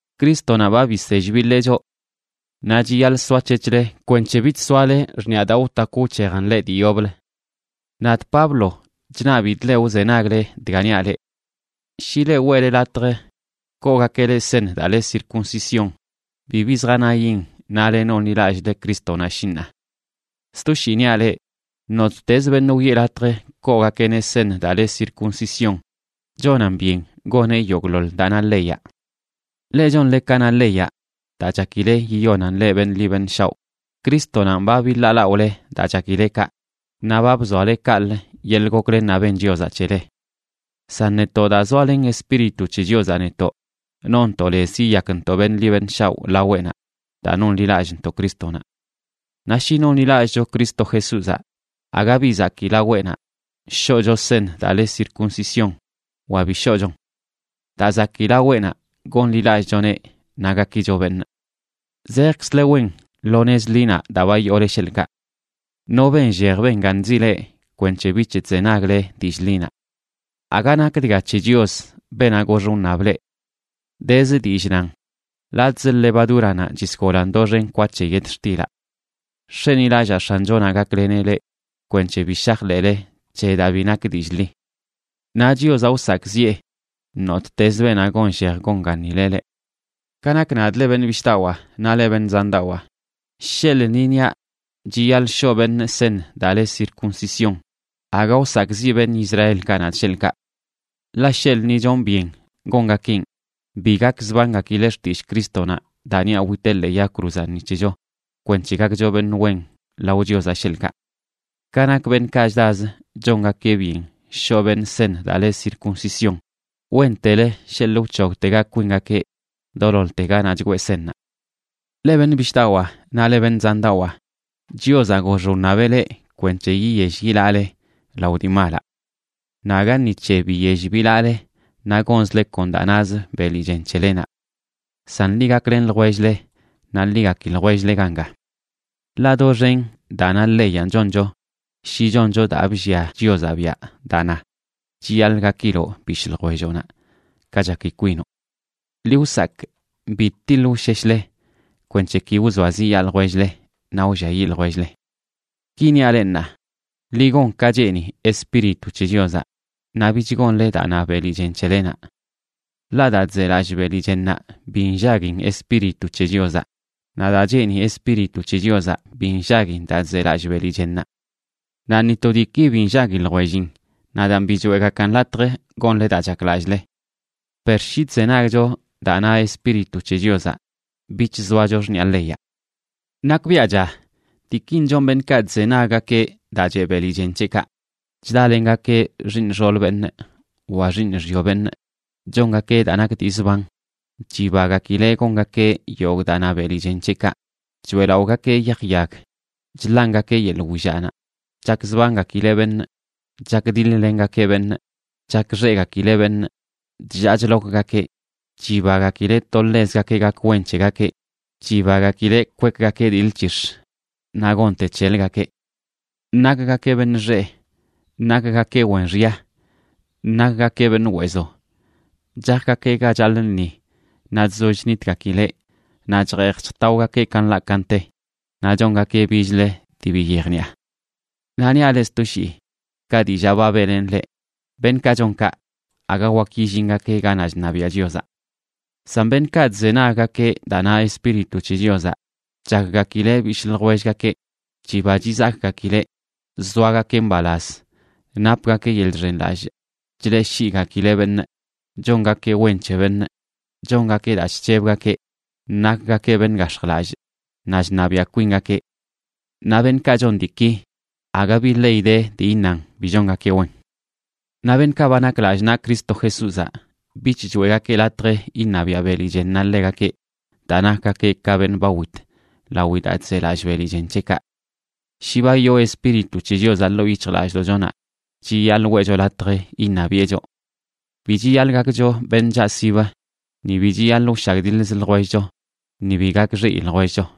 Crístonaꞌ ba bisell biḻee choꞌ. Naꞌ chiyaḻꞌ soac̱hec̱hle kwenc̱he bich soale xṉiꞌa daa wtakw wc̱hejan leꞌ dii yoblə. Nadꞌ Pablo chṉabidꞌ leꞌ wzenagle dga niaꞌ leꞌ. Shi leꞌ weꞌle latj koogakeꞌ leꞌ seṉ daa le circuncisión, bibi zjanayin nale nonḻilallꞌle Crístonaꞌ, shi ṉaa. Sto shii niaꞌ leꞌ, nottezə beṉꞌ wiꞌe latj koogakeꞌneꞌ seṉ daa le circuncisión chonan byen goneꞌ yogꞌḻoḻ daa na leyaꞌ. Leꞌ chonle ka na leyaꞌ daa chakile yiyonan leꞌ beṉꞌ ḻi beṉꞌ shaoꞌ, Crístonanꞌ ba biḻaalaꞌole daa chakile kaꞌ, naꞌ ba bzoale kaꞌlə yeḻꞌ goklennaꞌ ben Chiozaꞌ c̱hele. San netoꞌ, daa zoalen Espíritu c̱he Chiozaꞌ netoꞌ, nonntoꞌ lez yiyakntoꞌ beṉꞌ ḻi beṉꞌ shaoꞌ laweꞌnaꞌ daa nonḻilallꞌntoꞌ Crístonaꞌ. Naꞌ shi nonḻilallꞌcho Cristo Jesúzaꞌ, aga bi zakii laweꞌnaꞌ shoꞌcho seṉ daa le circuncisión wa bi shoꞌchon. Daa zakii laweꞌnaꞌ gonḻilallꞌchoneꞌ naꞌ gakicho beṉꞌ. Zejkzle wen lo nez ḻinaꞌ daa ba yoole, sheḻꞌkaꞌ. ¿No benllej benganzi leꞌ kwenc̱he bich chzenagle dillꞌ ḻinaꞌ? Aga nak dga c̱he Chios, beenaꞌ gox wṉab leꞌ. Dezə dillꞌ nan “latꞌzə levadúranaꞌ chisgolan doxen kwa c̱he yetxtilaꞌ”. Nx̱enilallaa X̱anchonaꞌ gakleneꞌ leꞌ kwenc̱he bi shajḻeꞌle c̱he daa bi nak dillꞌ ḻi. Naꞌ Chiozaꞌ wsakꞌziꞌe nottezə beenaꞌ gonllej gonganileꞌ leꞌ. Ka nak nadꞌ, leꞌ beṉꞌ bishꞌdawaa naꞌ leꞌ beṉꞌ zandawaa, sheḻꞌ ni niaꞌ chiyaḻꞌ shoꞌ beṉꞌ seṉ daa le circuncisión, aga wsakꞌziꞌ beṉꞌ Israelkaꞌ nadꞌ, sheḻꞌkaꞌ. Ḻaꞌ sheḻꞌ ni chonꞌ byen gongakeꞌn, bi gakzbangakileꞌ xtillꞌ Crístonaꞌ daa niaꞌ witeꞌ ḻee yag cruzaꞌ ni c̱hecho kwenc̱he gakcho beṉꞌ wen lao Chiozaꞌ, sheḻꞌkaꞌ. Ka nak beṉꞌkaꞌ chdazə chongakeꞌ byen shoꞌ beṉꞌ seṉ daa le circuncisión, ¡wentelə sheḻꞌ wc̱hogtega kwingakeꞌ doloḻte ganaꞌ chgwee seṉnaꞌ! Leꞌ beṉꞌ bishꞌdawaa naꞌ leꞌ beṉꞌ zandawaa, Chiozaꞌ gox wṉabeꞌ leꞌ kwenc̱he yiyell yilaꞌle lao dii malaꞌ. Naꞌ aga ni c̱he biyell bilaꞌle naꞌ gonzle kon daa nazə beli chen c̱helenaꞌ. San ḻi gaklen ljwell-le naꞌ ḻi gaki ljwell-le ganga. Ḻaꞌ doxen daa na leyanꞌ choncho shi choncho daa bllia Chiozaꞌ biaꞌ daa na: “Chiyaḻꞌ gakiloꞌ bishꞌ ljwelloꞌnaꞌ ka chaki kwinoꞌ.” Ḻi wsakꞌ bi tiḻ wsheshle kwenc̱he ki wzoaziꞌyaa ljwell-le naꞌ wlliayiꞌ ljwell-le. Ki niaꞌ leꞌ ṉaa: ḻi gon ka cheeni Espíritu c̱he Chiozaꞌ, naꞌ bich gonle daa na beli chen c̱helenaꞌ. Ḻaꞌ daa chzelallꞌ beli chennaꞌ bi nllaguin Espíritu c̱he Chiozaꞌ, naꞌ daa cheeni Espíritu c̱he Chiozaꞌ bi nllaguin daa chzelallꞌ beli chennaꞌ. Naꞌ ni to diiki bi nllagui ljwellin, naꞌ daan bi choeꞌgakan latj gonle daa chaklallꞌle. Per shi chzenagcho daa na Espíritu c̱he Chiozaꞌ, bich zoacho xṉiꞌa leyaꞌ. Nakbiaꞌcha diikin chon beṉꞌkaꞌ chzenaggakeꞌ daa cheꞌ beli chen c̱heꞌkaꞌ: chdalengakeꞌ xiiṉ xool beṉꞌ wa xiiṉ xyo beṉꞌ, chongakeꞌ daa nak dii zban, chibagakileꞌ gongakeꞌ yogꞌ daa na beli chen c̱heꞌkaꞌ, choeꞌlaꞌogakeꞌ yaj yag, chḻangakeꞌ yeḻꞌ willaꞌnaꞌ, chakzbangakileꞌ beṉꞌ, chakdiḻ-lengakeꞌ beṉꞌ, chakxeꞌgakileꞌ beṉꞌ, chllaa chlokgakeꞌ, chibagakileꞌ to ḻezgakeꞌ gak wen c̱hegakeꞌ, chibagakileꞌ kwekgakeꞌ diḻ c̱hix̱ naꞌ gonte c̱heləgakeꞌ. Nakgakeꞌ beṉꞌ xeꞌ, nakgakeꞌ wen xya, nakgakeꞌ beṉꞌ weezo, chajgakeꞌ ga chaḻꞌ lṉi naꞌ chzoll chnitgakileꞌ naꞌ chjeej chjtaogakeꞌ ka nḻaꞌ ka nte, naꞌ chongakeꞌ bichlə dii bi yejniꞌa. Naꞌ niaꞌ leꞌ sto shii, ka dillaa ba beꞌlenꞌ leꞌ, beṉꞌkaꞌ chon kaꞌ aga wak yillingakeꞌ ganaꞌ chṉabiaꞌ Chiozaꞌ. San beṉꞌkaꞌ chzenaggakeꞌ daa na Espíritu c̱he Chiozaꞌ chakgakileꞌ bishꞌ ljwellgakeꞌ, chiba chizakꞌgakileꞌ, zoagakeꞌ mbalaz, napgakeꞌ yeḻꞌ chxenlallꞌ, chleꞌshiꞌgakileꞌ beṉꞌ, chongakeꞌ wen c̱he beṉꞌ, chongakeꞌ daa chc̱hebgakeꞌ, nakgakeꞌ beṉꞌ gax̱jlallꞌ, naꞌ chṉabiaꞌ kwingakeꞌ. Naꞌ beṉꞌkaꞌ chon diiki aga bi ley de dii iṉan bi chongakeꞌ wen. Naꞌ beṉꞌkaꞌ ba nak lallꞌ naꞌ Cristo Jesúzaꞌ bich choeꞌgakeꞌ latj iṉabiaꞌ beli chennaꞌ ḻegakeꞌ daa nakgakeꞌ ka beṉꞌ ba wit lawi daa chzelallꞌ beli chen c̱heꞌkaꞌ. Shi ba yoo Espíritu c̱he Chiozaꞌ ḻoo yic̱hjlallꞌdoꞌchonaꞌ, chiyaḻꞌ weꞌcho latj iṉabiꞌe choꞌ. Bi chiyaḻꞌ gakcho beṉꞌ chaꞌsib, ni bi chiyaḻꞌ wshagdiḻzə ljwellcho, ni bi gakxeꞌi ljwellcho.